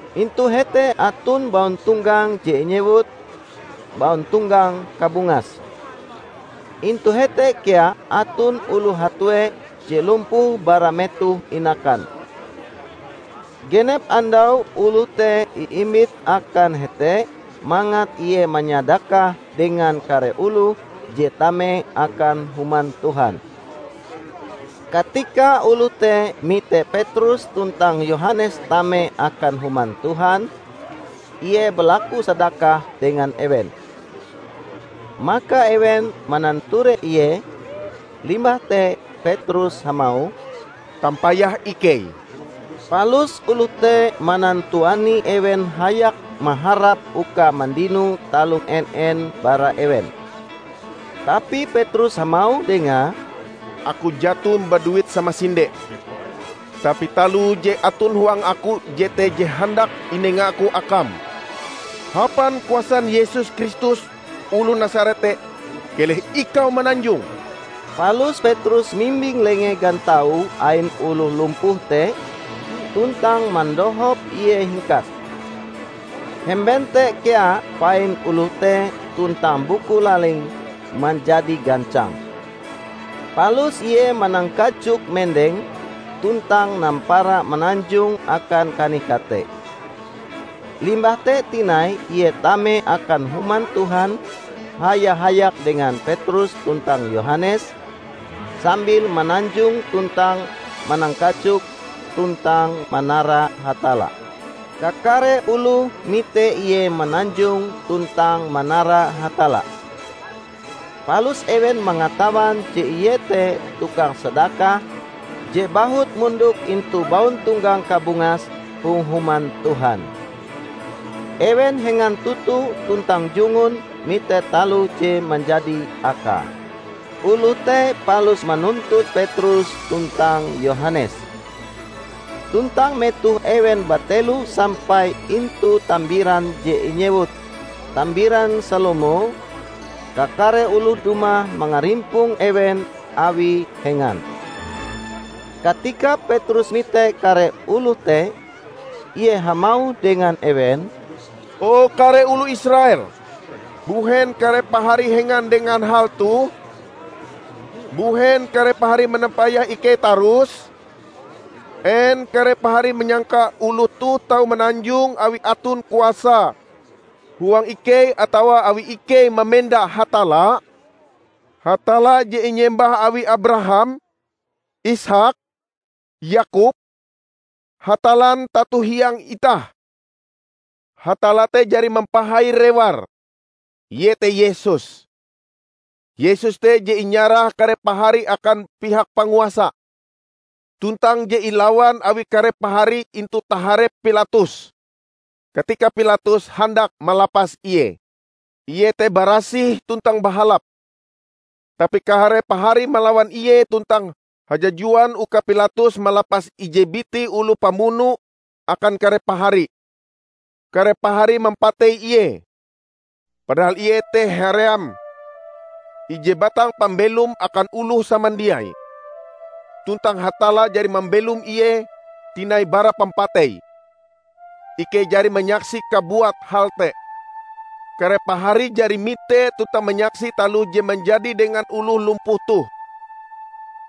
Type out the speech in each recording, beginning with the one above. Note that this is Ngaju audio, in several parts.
Intu hete aton bauntonggang je inyewut "Bauntonggang Kabungas". Intu hete kea aton oloh hatue je lumpuh bara metoh inakan. Genep andau oloh te iimbit akan hete mangat ie manyadakah dengan kare oloh je tame akan Human Tuhan. Katika oloh te mite Petrus tuntang Yohanes tame akan Human Tuhan, ie balaku sadakah dengan ewen. Maka ewen mananture ie, limbah te Petrus hamauh, "Tampayah ikei!" Palus oloh te manantuani ewen hayak maharap uka mandino taloh en-en bara ewen. Tapi Petrus hamauh dengae, "Aku jaton baduit samasinde. Tapi taloh je aton huang aku jete je handak inengaku akam: Hapan kuasan Yesus Kristus oloh Nasaret te, keleh ikau mananjong!" Palus Petrus mimbing lenge gantau ain oloh lumpuh te tuntang mandohop ie hingkat. Hemben te kea pain oloh te tuntang buku lalinge manjadi gancang. Palus ie manangkajok mendeng, tuntang nampara mananjong akan kanih-kate. Limbah te tinai ie tame akan Human Tuhan haya-hayak dengan Petrus tuntang Yohanes, sambil mananjong tuntang manangkajok tuntang manara Hatalla. Kakare oloh mite ie mananjong tuntang manara Hatalla. Palus ewen mangatawan je ie te tukang sadakah je bahut mondok intu "Bauntonggang Kabungas" hong Human Tuhan. Ewen hengan toto tuntang jungun mite taloh je manjadi akae. Oloh te palus manuntut Petrus tuntang Yohanes. Tuntang metoh ewen batelo sampai intu tambiran je inyewut "Tambiran Salomo", kakare oloh dumah mangarimpong ewen awi hengan. Katika Petrus mite kare oloh te, ie hamauh dengan ewen, "O kare oloh Israel, mbuhen kare pahari hengan dengan hal toh? Mbuhen kare pahari manampayah ikei tarus? En kare pahari manyangka oloh toh tau mananjong awi aton kuasa huang ikei atawa awi ikei mamenda Hatalla? Hatalla je inyembah awi Abraham, Isaak, Yakob, Hatallan tato-hiang itah, Hatalla te jari mampahai Reware, iete Yesus. Yesus te je inyarah kare pahari akan pihak panguasa, tuntang je ilawan awi kare pahari intu taharep Pilatus, katika Pilatus handak malapas Ie. Ie te barasih tuntang bahalap, tapi kare pahari malawan Ie tuntang hajajuan uka Pilatus malapas ije biti oloh pamuno akan kare pahari. Kare pahari mampatei Ie, padahal Ie te haream ije batang pambelom akan oloh samandiai. Tuntang Hatalla jari mambelom Ie tinai bara pampatei. Ikei jari manyaksi kabuat hal te. Kare pahari jari mite tuntang manyaksi taloh je manjadi dengan oloh lumpuh toh.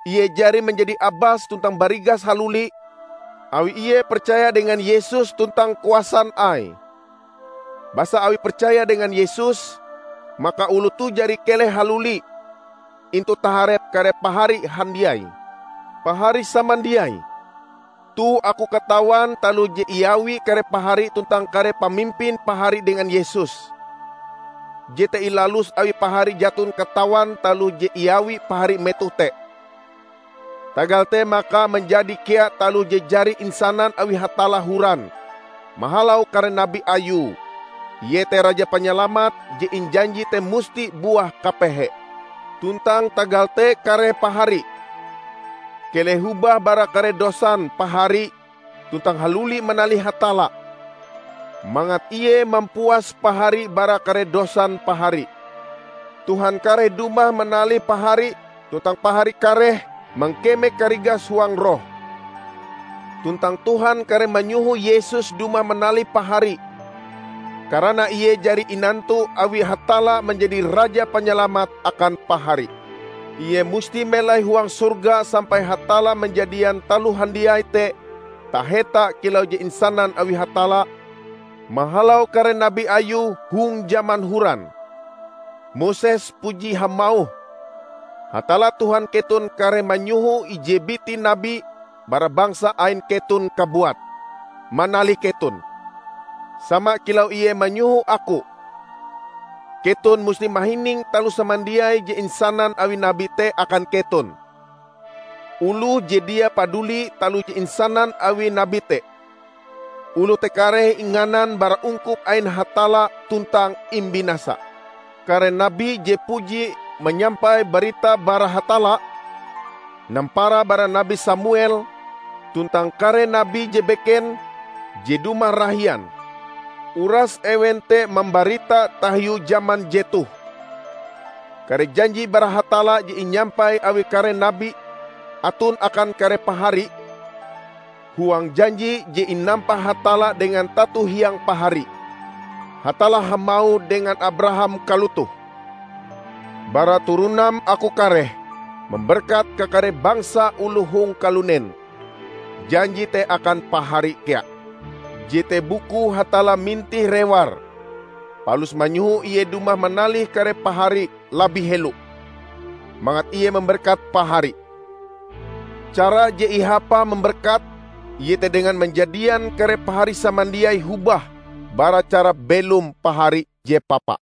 Ie jari manjadi abas tuntang barigas haluli awi ie percaya dengan Yesus tuntang kuasan Aie. Basa awi percaya dengan Yesus maka oloh toh jari keleh haluli intu taharep kare pahari handiai. Pahari samandiai! Toh aku katawan taloh je iawi kare pahari tuntang kare pamimpin pahari dengan Yesus, jete ilalus awi pahari jaton katawan taloh je iawi pahari metoh te. Tagal te maka manjadi kea taloh je jari insanan awi Hatalla horan mahalau kare nabi Ayue, iete Raja Panyalamat je injanji te musti buah kapehe. Tuntang tagal te kare pahari, keleh hobah bara kare dosan pahari tuntang haluli manalih Hatalla, mangat Ie mampuas pahari bara kare dosan pahari. Tuhan kareh dumah manalih pahari tuntang pahari kareh mangkeme karigas huang roh. Tuntang Tuhan kareh manyoho Yesus dumah manalih pahari, karana Ie jari inantu awi Hatalla manjadi Raja Panyalamat akan pahari. Ie musti melai huang sorga sampai Hatalla manjadian taloh handiai te taheta kilau je insanan awi Hatalla mahalau kare nabi Ayue hong jaman horan. Moses puji hamauh, 'Hatalla Tuhan keton kareh manyoho ije biti nabi bara bangsa ain keton kabuat, manalih keton, sama kilau Ie manyoho aku. Keton musti mahining taloh samandiai je insanan awi nabi te akan keton. Oloh je dia paduli taloh je insanan awi nabi te, oloh te kareh inganan bara ungkup ain Hatalla tuntang imbinasa.' Kare nabi je puji manyampai barita bara Hatalla, nampara bara Nabi Samuel tuntang kare nabi je beken je dumah rahian, uras ewen te mambarita tahiu jaman jetoh. Kare janji bara Hatalla je inyampai awi kare nabi aton akan kare pahari. Huang janji je inampa Hatalla dengan tato hiang pahari, Hatalla hamauh dengan Abraham kalotoh, 'Bara turonam aku kareh mamberkat kakare bangsa oloh hong kalunen.' Janji te akan pahari kea. Jete bukue Hatalla mintih reware, palus manyoho Ie dumah manalih kare pahari labih helo, mangat Ie mamberkat pahari. Cara je ihapae mamberkat iete dengan manjadian kare pahari samandiai hobah bara cara belom pahari je papa."